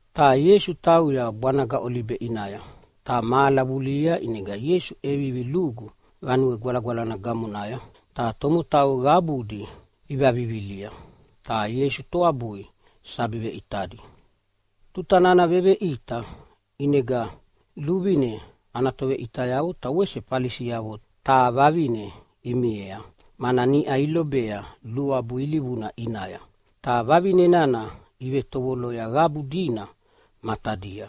Ta Ieisu tauya bwanaga Olibe ʼinaya. Ta mahala vulihia ʼinega Ieisu ʼevivi lugu Vanue Gwalagwalana gamonaya, ta tomotau qabudi ivavivilia ta Ieisu toabui sabi veʼitadi. Tuta nana veveʼita, ʼinega luvine ana toveʼitayavo ta wese Falisiavo taha vavine imiea, mana niʼa ilobea luabu ilivuna ʼinaya, ta vavine nana ivetovoloya qabu dina matadia.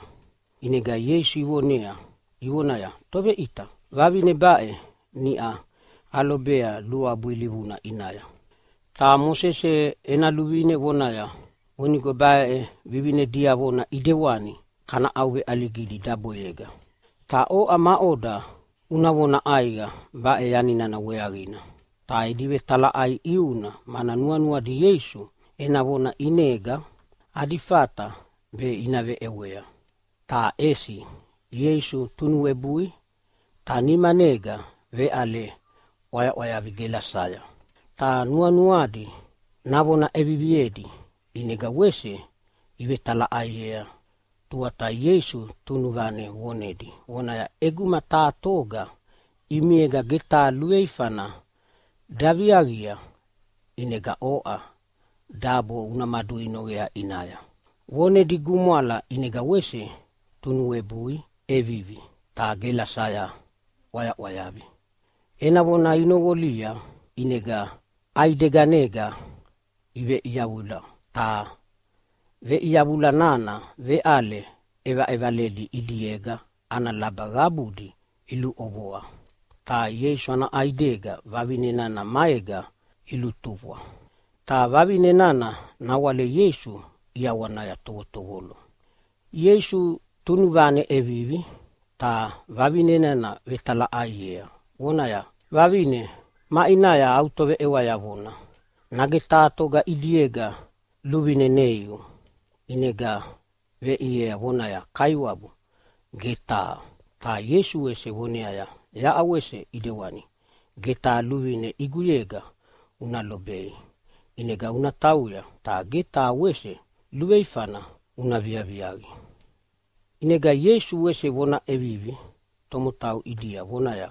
ʼInega Ieisu ivonea ivonaya, “Toveʼita, vavine baʼe niʼau alobea luabu ilivuna ʼinaya. Ta Mosese ena luvine vonaya vonigo baʼe vivine diavona ʼidewani kana ʼauveʼaligidi daboyega. Ta oʼa, maʼoda una vona ʼaiqa baʼe yani nana weaqina?” Ta edi vetalaʼai ʼiuna mana nuanuadi Ieisu ena vona ʼinega adi fata be ina veʼewea. Ta ʼesi Ieisu tunuwebui ta nimanega veʼale ʼwayaʼwayavi gelasaya. Ta nuanuadi navona ʼeviviedi ʼinega wese ivevetalaʼaiea, tuata Ieisu tunuvane vonedi vonaya, “ʼEguma taha toga ʼimiega ge taha luveifana daviaqia ʼinega oʼa dabo una maduinoqea ʼinaya.” Vonedi gumwala ʼinega wese tunuwebui ʼevivi ta gelasaya ʼwayaʼwayavi. Ena vona inoqolia, ʼinega ʼaideganega iveʼiyavula, ta veʼiyavula nana veʼale ʼevaʼevaledi ʼidiega ana laba qabudi iluʼovoa, ta Ieisu ana ʼaidega vavine nana maega ilutufwa, ta vavine nana nawale Ieisu ʼiawanaya tovotovolo. Ieisu tunuvane ʼevivi ta vavine nana vetalaʼaiea, vonaya, “Vavine, maʼinaya au toveʼewayavona? Nage taha toga ʼidiega luvine neiu?” ʼInega veʼiea vonaya, “Kaiwabu, ge taha.” Ta Ieisu wese voneaya, “Yaʼa wese ʼidewani, ge taha luvine ʼiguyega una lobei. ʼInega una tauya, ta ge taha wese luveifana una viaviaqi.”] ʼInega Ieisu wese vona ʼevivi tomotau ʼidia, vonaya,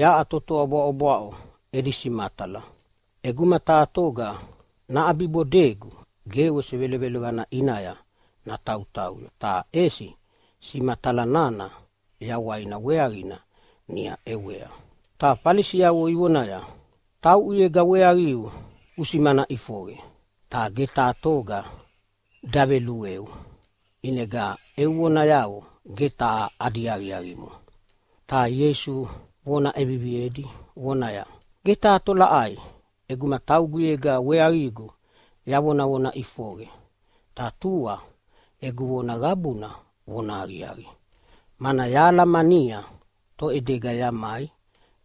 “Yaʼa totoa bwaʼobwaʼo edi simatala. ʼEguma taha toga naʼabibodegu ge wese velovelovana ʼinaya natautauya, ta ʼesi simatala nana yawaina weaqina niʼa ʼewea.” Ta Falisiavo ivonaya, “Tauʼuyega weaqiu usimana ʼifoqe, ta ge taha toga davelueu, ʼinega eu vonayavo ge taha adi aqiaqimo.” Ta Ieisu vona ʼeviviedi vonaya, “Ge taha tolaʼai ʼeguma tauguyega weaqigu yavonavona ʼifoqe, ta tua egu vona qabuna vonahaqiaqi, mana yahalamania toʼedega yamai,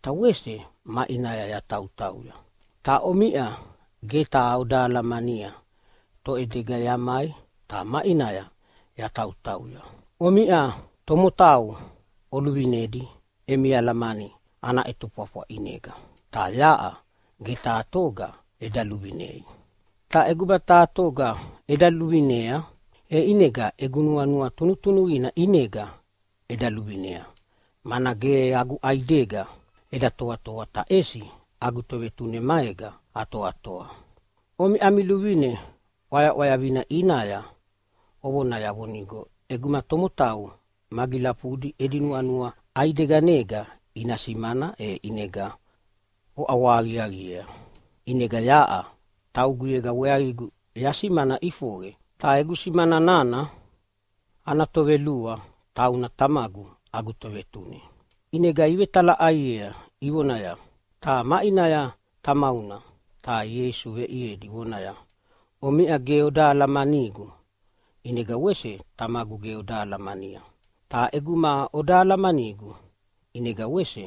ta wese maʼinaya yatautauya. Ta omiʼa ge taha oda alamania toʼedega yamai ta maʼinaya yatautauya. Omiʼa tomotau oluvinedi emi alamani ana ʼetofwafwa ʼinega, ta yaʼa ge taha toga eda luluvinei. Ta ʼeguma taha toga eda luvinea, e ʼinega egu nuanua tunutunuqina ʼinega eda luvinea, mana ge agu ʼaidega eda toatoa, ta ʼesi agu Tovetune maega atoatoa. Omiʼa ami luvine ʼwayaʼwayavina ʼinaya ovonaya vonigo ʼeguma tomotau magilafudi edi nuanua ʼaideganega ina simana e ʼinega oʼawahaqiaqiea. ʼInega yaʼa tauguyega weaqigu yasimana ʼifoqe, ta egu simana nana ana tovelua tauna Tamagu agu Tovetune.” ʼInega ivetalaʼaiea ivonaya, “Ta maʼinaya tamauna?” Ta Ieisu veʼiedi vonaya, “Omiʼa ge oda alamanigu, ʼinega wese Tamagu ge oda alamania. Ta ʼeguma oda alamanigu ʼinega wese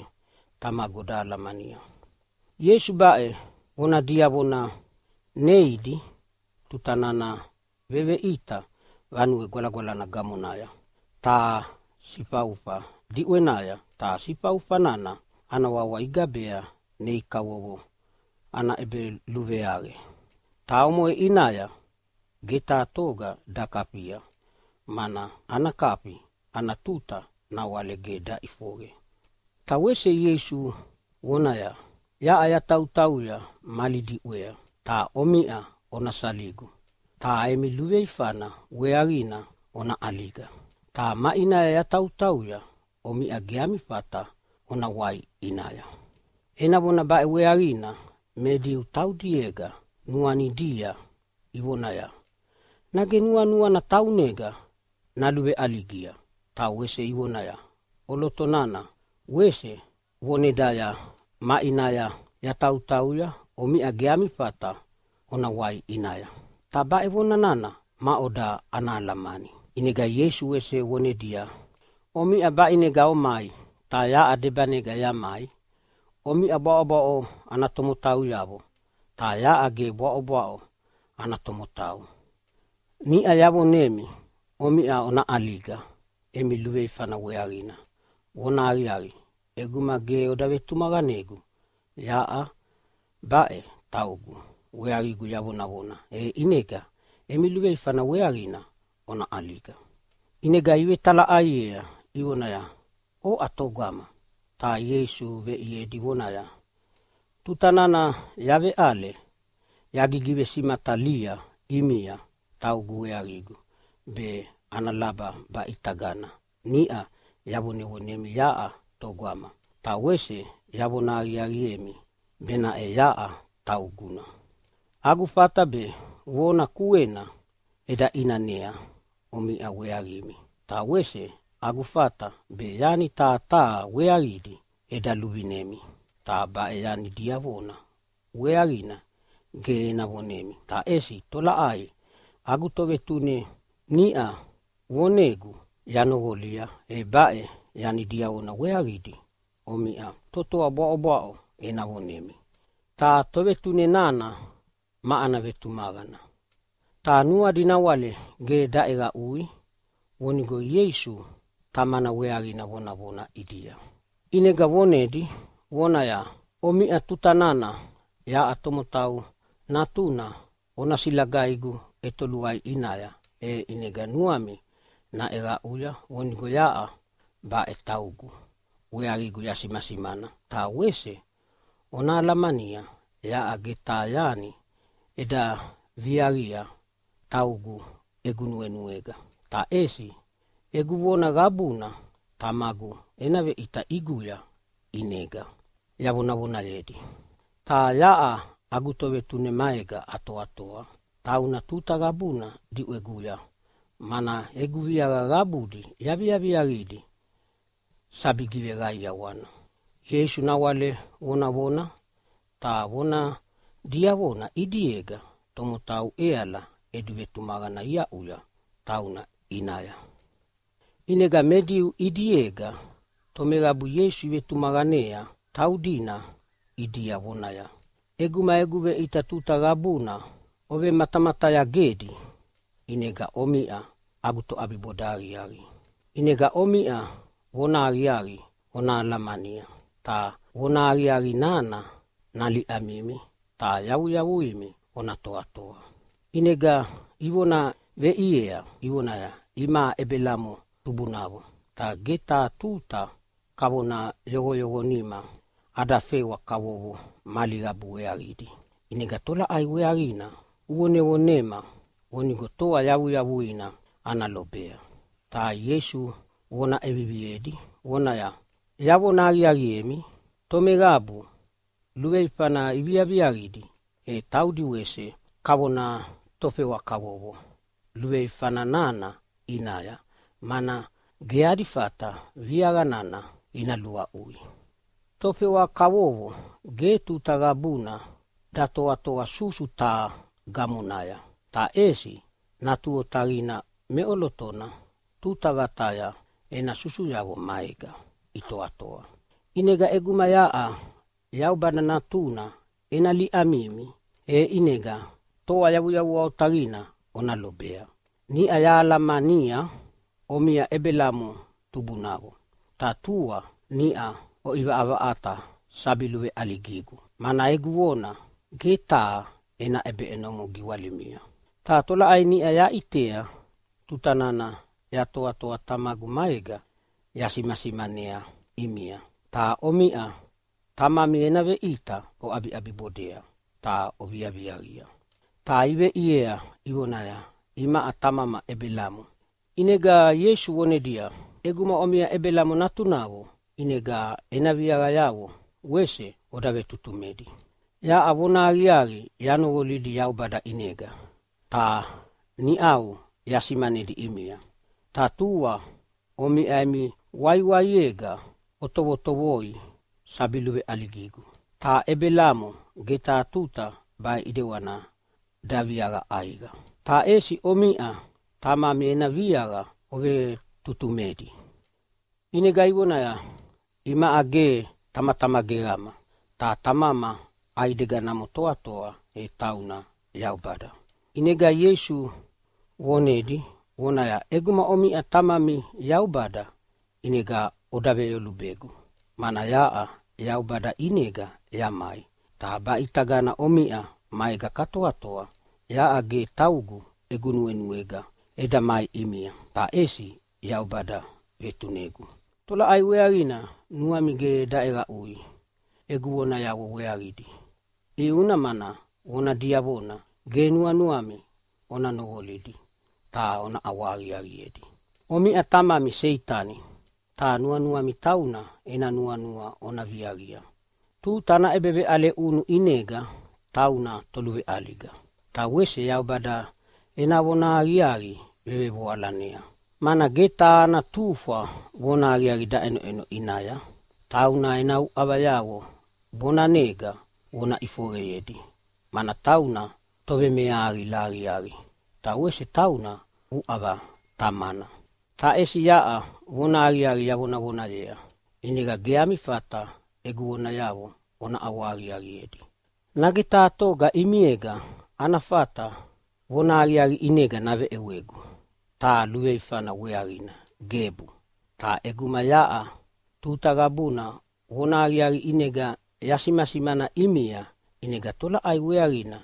Tamagu oda alamania.” Ieisu baʼe vona diavona neidi tuta nana veveʼita Vanue Gwalagwalana gamonaya taha sifaufa diʼwenaya, ta sifaufa nana ana wawa igabea nei kavovo ana ʼebeluveaqe. Ta omoʼe ʼinaya ge taha toga dakafia, mana ana kafi ana tuta nawale ge daʼifoqe. Ta wese Ieisu vonedi vonaya, “Yaʼa yatautauya mali diʼwea, ta omiʼa ona saligu, ta emi luveifana weaqina ona ʼaliga. Ta maʼinaya yatautauya omiʼa ge ami fata ona wai ʼinaya.” Ena vona baʼe weaqina me Diu taudiega nuanidia ivonaya, “Nage nuanuana taunega naluveʼaligia?” Ta wese ivonaya, “ʼOloto nana wese vonedaya, ‘Maʼinaya yatautauya omiʼa ge ami fata ona wai ʼinaya.’ Ta baʼe vona nana maʼoda ana alamani?” ʼInega Ieisu wese vonedia, “Omiʼa baʼinega omai, ta yaʼa debanega yamai. Omiʼa bwaʼobwaʼo ana tomotauyavo, ta yaʼa ge bwaʼobwaʼo ana tomotau. Niʼa yavonemi omiʼa ona ʼaliga emi luveifana weaqina. Vonahaqiaqi, ʼeguma ge oda vetumaqanegu yaʼa baʼe taugu weaqigu yavonavona, e ʼinega emi luveifana weaqina ona ʼaliga.” ʼInega ivetalaʼaiea ivonaya, “Oʼa togama?” Ta Ieisu veʼiedi vonaya, “Tuta nana yaveʼale yagivesimatalia ʼimia taugu weaqigu be ana laba baʼitagana niʼa yavonemi yaʼa togama, ta wese yavona aqiaqiemi benaʼe yaʼa tauguna. Agu fata be vona kuena eda ʼinanea omiʼa weaqimi, ta wese agu fata be yani taha taha weaqidi eda luvinemi. Ta baʼe yani diavona weaqina ge ena vonemi, ta ʼesi tolaʼai agu Tovetune niʼa vonegu ta yanoqolia e baʼe yani diavona weaqidi omiʼa totoa bwaʼobwaʼo ena vonemi. Ta Tovetune nana ma ana vetumaqana!” Ta nuadi nawale ge daʼeqaʼui vonigo Ieisu Tamana weaqina vonavona ʼidia. ʼInega vonedi vonaya, “Omiʼa tuta nana yaʼa Tomotau Natuna ona silagaigu ʼetoluai ʼinaya, e ʼinega nuami naʼeqaʼuya vonigo yaʼa baʼe taugu weaqigu yasimasimana. Ta wese ona alamania yaʼa ge taha yani eda viaviaqia taugu egu nuenuega, ta ʼesi egu vona qabuna Tamagu ena veʼita ʼiguya ʼinega yavonavonayedi. Ta yaʼa agu Tovetune maega atoatoa. Tauna tuta qabuna diʼweguya, mana egu viaqa qabudi yaviaviaqidi sabi giveqaiawana.” Ieisu nawale vonavona, ta vona diavona ʼidiega tomotau ʼeala edi vetumaqana iaʼuya tauna ʼinaya. ʼInega me Diu ʼidiega tomeqabu Ieisu ivetumaqanea taudina ʼidia vonaya, “ʼEguma egu veʼita tuta qabuna ovelumatamatayagedi, ʼinega omiʼa agu toʼabiboda aqiaqi. ʼInega omiʼa vonahaqiaqi ona alamania, ta vonahaqiaqi nana naliʼamimi ta yavuyavuimi ona toatoa.” ʼInega ivona veʼiea ivonaya, “Imaʼa Ebelamo tubunavo, ta ge taha tuta kavona yoqoyoqonima ada fewa kavovo mali qabu weaqidi. ʼInega tolaʼai weaqina uvonevonema vonigo toa yavuyavuina ana lobea?” Ta Ieisu vona ʼeviviedi vonaya, “Yavona aqiaqiemi, tomeqabu luveifana iviaviaqidi, e taudi wese kavona tofewa kavovo luveifa nana ʼinaya, mana ge adi fata viaqa nana ina luaʼui. Tofewa kavovo ge tuta qabuna datoatoa susu taha gamonaya, ta ʼesi natu otaqina meʼolotona tuta vataya ena susuyavo maega itoatoa. ʼInega ʼeguma yaʼa Yaubada Natuna ena liʼamimi, e ʼinega toa yavuyavua otaqina ona lobea! Niʼa yahalamania omiʼa Ebelamo tubunavo. Ta tua niʼa oʼivaʼavaʼata sabi luveʼaligigu, mana egu vona ge taha ena ʼebeʼenomo giwalimia. Ta tolaʼai niʼa yaʼitea tuta nana yatoatoa Tamagu maega yasimasimanea ʼimia. Ta omiʼa tamami ena veʼita oʼabiʼabibodea ta oviaviaqia.” Ta iveʼiea ivonaya, “Imaʼa tamama Ebelamo!” ʼInega Ieisu vonedia, “ʼEguma omiʼa Ebelamo natunavo ʼinega ena viaqayavo wese oda vetutumedi. Yaʼa vonahaqiaqi yanoqolidi Yaubada ʼinega ta niʼau yasimanedi ʼimia. Ta tua omiʼa emi waiwiaega otovotovoi sabi luveʼaligigu. Ta Ebelamo ge taha tuta baʼe ʼidewani daviaqa ʼaiqa. Ta ʼesi omiʼa tamami ena viaqa ovevetutumedi.” ʼInega ivonaya, “Imaʼa ge tamatama geqama. Ta tamama ʼaideganamo toatoa, e tauna Yaubada.” ʼInega Ieisu vonedi vonaya, “ʼEguma omiʼa tamami Yaubada ʼinega oda veveyolubegu, mana yaʼa Yaubada ʼinega yamai ta baʼitagana omiʼa maega katoatoa. Yaʼa ge taugu egu nuenuega eda mai ʼimia, ta ʼesi Yaubada vetunegu. Tolaʼai weaqina nuami ge daʼeqaʼui egu vonayavo weaqidi? ʼIuna mana vona diavona ge nuanuami ona noqolidi ta ona ʼawahaqiaqiedi. Omiʼa tamami Seitani, ta nuanuami tauna ena nuanua ona viaqia. Tuta ana ʼebeveʼale ʼunu ʼinega tauna toluveʼaliga, ta wese Yaubada ena vonahaqiaqi vevevoalanea, mana ge taha ana tufwa vonahaqiaqi daʼenoʼeno ʼinaya. Tauna ena uʼavayavo bonanega vona ʼifoqeyedi, mana tauna tovemeahaqila aqiaqi ta wese tauna uʼava tamana. “Ta ʼesi yaʼa vonahaqiaqi yavonavonayea, ʼinegana ge ami fata egu vonayavo ona ʼawahaqiaqiedi. Nage taha toga ʼimiega ana fata vonahaqiaqi ʼinega naveʼewegu taha luveifana weaqina? Gebu! Ta ʼeguma yaʼa tuta qabuna vonahaqiaqi ʼinega yasimasimana ʼimia, ʼinega tolaʼai weaqina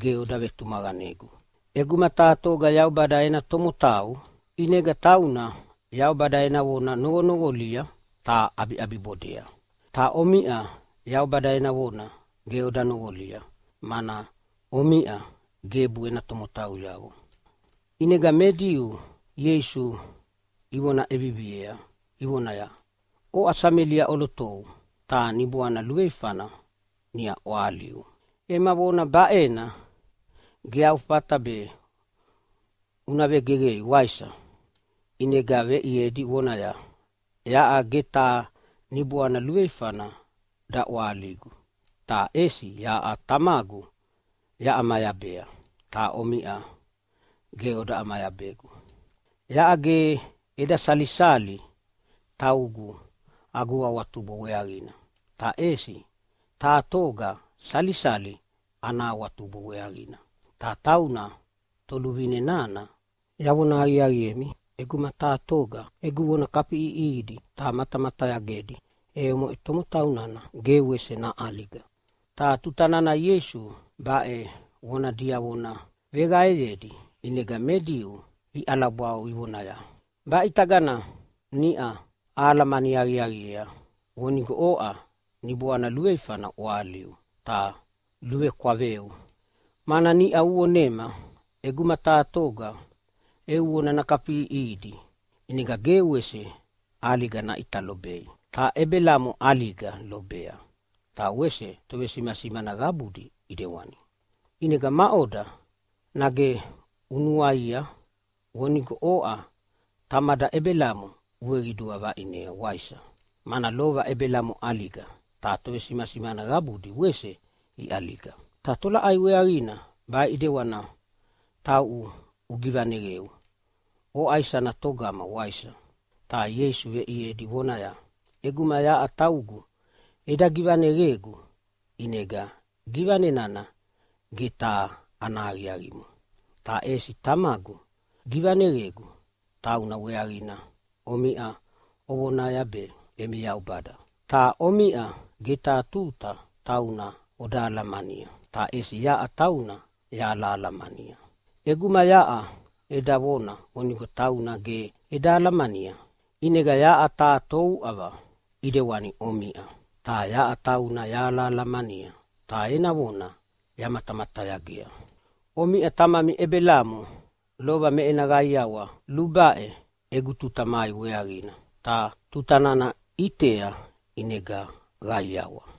ge oda vetumaqanegu? ʼEguma taha toga Yaubada ena tomotau, ʼinega tauna Yaubada ena vona noqonoqolia ta ʼabiʼabibodea. Ta omiʼa Yaubada ena vona ge oda noqolia, mana omiʼa gebu ena tomotauyavo!” ʼInega me Diu Ieisu ivona ʼeviviea ivonaya, “Oʼa Samelia ʼolotou ta niboana luveifana niʼa ʼwahaliu! Ema vona baʼena ge au fata be una vegeqei, waisa?” ʼInega veʼiedi vonaya, “Yaʼa ge taha niboana luveifana daʼwahaligu, ta ʼesi yaʼa Tamagu yaʼamayabea, ta omiʼa ge oda ʼamayabegu. Yaʼa ge eda salisali taugu agu awatubo weaqina, ta ʼesi taha toga salisali ana awatubo weaqina, ta tauna Toluvine nana. Yavona aqiaqiemi, ʼeguma taha toga egu vona kafiʼiʼihidi ta matamatayagedi, e omoʼe tomotau nana ge wese naʼaliga.” Ta tuta nana Ieisu baʼe vona diavona veqaeyedi ʼinega me Diu iʼalabwau ivonaya, “Baʼitagana niʼa ahalamani aqiaqiea vonigo oʼa niboana luveifana ʼwahaliu ta luvekwaveu! Mana niʼa uvonema ʼeguma taha toga eu vona nakafiʼiʼihidi ʼinega ge wese ʼaliga naʼita lobei. Ta Ebelamo ʼaliga lobea, ta wese tovesimasimana qabudi ʼidewani. ʼInega maʼoda, nage unuaia vonigo oʼa tamada Ebelamo uveqidua vaʼinea, waisa? Mana lova Ebelamo ʼaliga, ta tovesimasimana qabudi wese iʼaliga. Ta tolaʼai weaqina baʼe ʼidewani tauʼu ugivaneqeu, oʼa isana togama waisa?” Ta Ieisu veʼiedi vonaya, “ʼEguma yaʼa taugu eda givaneqegu ʼinega givane nana ge taha ana aqiaqimo. Ta ʼesi Tamagu gigivaneqegu, tauna weaqina omiʼa ovonaya be emi Yaubada. Ta omiʼa ge taha tuta tauna oda alamania, ta ʼesi yaʼa tauna yahalahalamania. ʼEguma yaʼa eda vona vonigo tauna ge eda alamania, ʼinega yaʼa taha touʼava ʼidewani omiʼa. Ta yaʼa tauna yahalahalamania, ta ena vona yamatamatayagea. Omiʼa tamami Ebelamo lova me ena qaiawa lubaʼe egu tuta mai weaqina, ta tuta nana ʼitea ʼinega qaiawa.”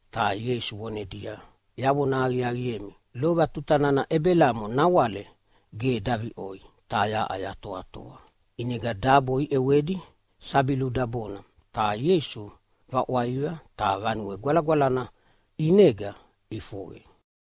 Ta Ieisu vonedia, “Yavona aqiaqiemi, lova tuta nana Ebelamo nawale ge daviʼoi, ta yaʼa yatoatoa.” ʼInega dabo iʼewedi sabi ludabona, ta Ieisu vaʼwaiva ta Vanue Gwalagwalana ʼinega ʼifoqe.